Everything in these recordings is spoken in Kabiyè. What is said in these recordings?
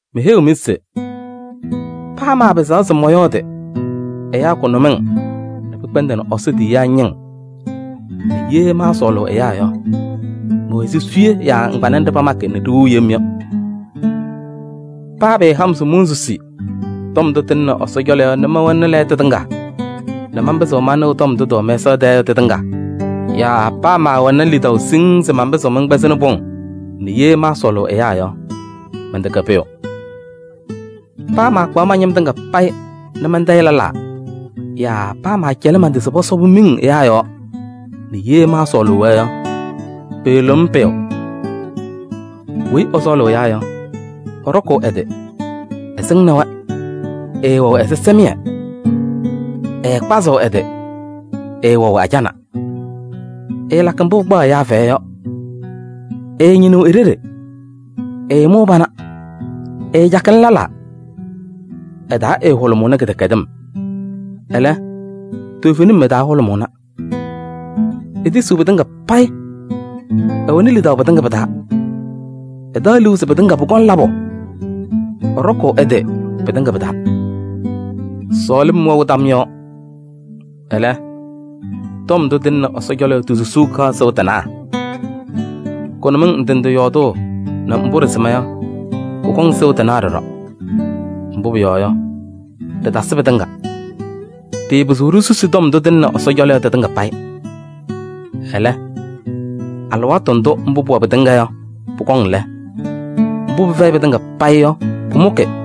Meheyiɣ-mɩ se: paa maapɩzaɣ se mɔyɔɔdɩ ɛyaa kʋnʋmɩŋ nɛ pɩkpɛndɩnɩ Ɛsɔ tiyiyaa ñɩŋ nɛ ye maasɔɔlʋʋ ɛyaa yɔ, mɛwɛ ɛzɩ suye yaa ŋgbanɛ nɖɩ pamakɩ nɛ ɖiwiɣ yem yɔ. Paa pɩɩha-m se monsusi tɔm ndʋ tɩlɩnɩ Ɛsɔ cɔlɔ yɔ nɛ mɛwɛnɩ lɛɣtʋ tɩŋa nɛ manpɩzɩɣ manɩɣ tɔm ndʋ tɩwɛ mɛsaɣ tɛɛ yɔ tɩtɩŋa yaa paa maawɛnɩ lidaʋ siŋŋ se manpɩzɩɣ mɛnkpɛzɩɣnɩ pʋŋ nɛ ye maasɔɔlʋʋ ɛyaa yɔ, mɛntɛkɛ pʋyʋ. Paa maakpaɣ ma-ñɩm tɩŋa payɩ nɛ mantayɩ lɛlaa yaa paa maacɛlɩ man-tɩ se pɔsɔbɩ-m miŋ ɛyaa yɔɔ nɛ ye maasɔɔlʋʋ-wɛ yɔ, pɩɩlɩɣ-m pʋyʋ. Weyi ɛsɔɔlʋʋ ɛyaa yɔ, ɛɖɔkʋʋ ɛ-tɩ, ɛsɩŋnɩ-wɛ, ɛɛwɛɣ ɛzɩsɛmɩyɛ. Ɛɛkpazɩɣ ɛ-tɩ, ɛɛwɛɣ ajana. Ɛɛlakɩ mbʋ pɩkpaɣ ɛyaa fɛyɛ yɔ, ɛɛñɩnɩɣ e-ɖeɖe, ɛɛmʋʋ pana, ɛɛcakɩnɩ lɛlaa. Ɛ-taa ɛɛhʋlʋmʋʋnɩ kɩdɛkɛdɩm, ɛlɛ, toovenim ɛ-taa hʋlʋmʋʋna. Etisiɣ pɩtɩŋa payɩ, ɛwɛnɩ lidaʋ pɩtɩŋa pɩ-taa, ɛtaɣ liu se pɩtɩŋa payɩ pʋkɔŋ labʋ, ɛɖɔkʋʋ ɛ-tɩ pɩtɩŋa pɩ-taa. Sɔɔlɩm wɛɣ tam yɔɔ, ɛlɛ, tɔm ndʋ tɩlɩnɩ Ɛsɔ cɔlɔ yɔ ti-susuu kaɣ sɩʋ tɩnaɣ. Kʋnʋmɩŋ ndɩ ndɩ yɔɔdʋʋ nɛ mbʋ ɖɩsɩma yɔ, pɔkɔŋ sɩʋ tɩnaɣ ɖɔɖɔ. Mbʋ pʋyɔɔ yɔ, ɖɩtasɩ pɩtɩŋa. Ɖɩɩpɩzɩɣ ɖisusi tɔm ndʋ tɩlɩnɩ Ɛsɔ cɔlɔ yɔ tɩtɩŋa payɩ. Ɛlɛ, alɩwaatʋ ndʋ mbʋ pʋwɛ pɩtɩŋa payɩ yɔ pʋkɔŋ lɛ, mbʋ pɩfɛyɩ pɩtɩŋa payɩ yɔ pʋmʋkɩ.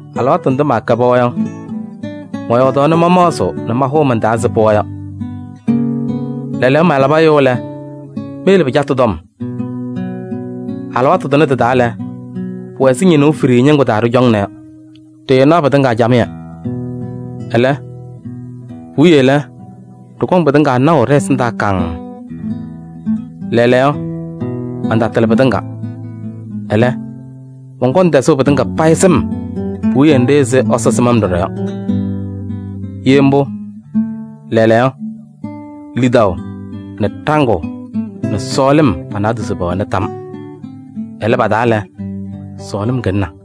Alɩwaatʋ ndʋ maakɛ pɩɣa yɔ, mɔyɔɔdaɣ nɛ mamaɣzɩɣ nɛ mahʋʋ man-taa ɛzɩ pɩɣa yɔ. Lɛɛlɛɛyɔ malabɩ ɛyʋ lɛ, meyele pɩcatʋ tɔm. Alɩwaatʋ tʋnɛ tɩ-taa lɛ, pʋwɛ ɛzɩ ñɩnʋʋ fiɖiyii ñɩŋgʋ taa ɖɩcɔŋna yɔ, ɖɩɩnaɣ pɩtɩŋa camɩyɛ. Ɛlɛ puwiye lɛ, ɖɩkɔŋ pɩtɩŋa naʋ ɖɛ-ɛsɩndaa kaŋŋ. Lɛɛlɛɛyɔ mantatɩlɩ pɩtɩŋa, ɛlɛ, mɔnkɔŋ tɛzʋʋ pɩtɩŋa payɩ sɩm puwiye nɖɩ ɛzɩ Ɛsɔ sɩm-m ɖɔɖɔ yɔ. Ye mbʋ, lɛɛlɛɛyɔ lidaʋ nɛ ɖaŋʋʋ nɛ sɔɔlɩm pa-naadozo pɛwɛɣna tam. Ɛlɛ, pa-taa lɛ, sɔɔlɩm kɩlɩna.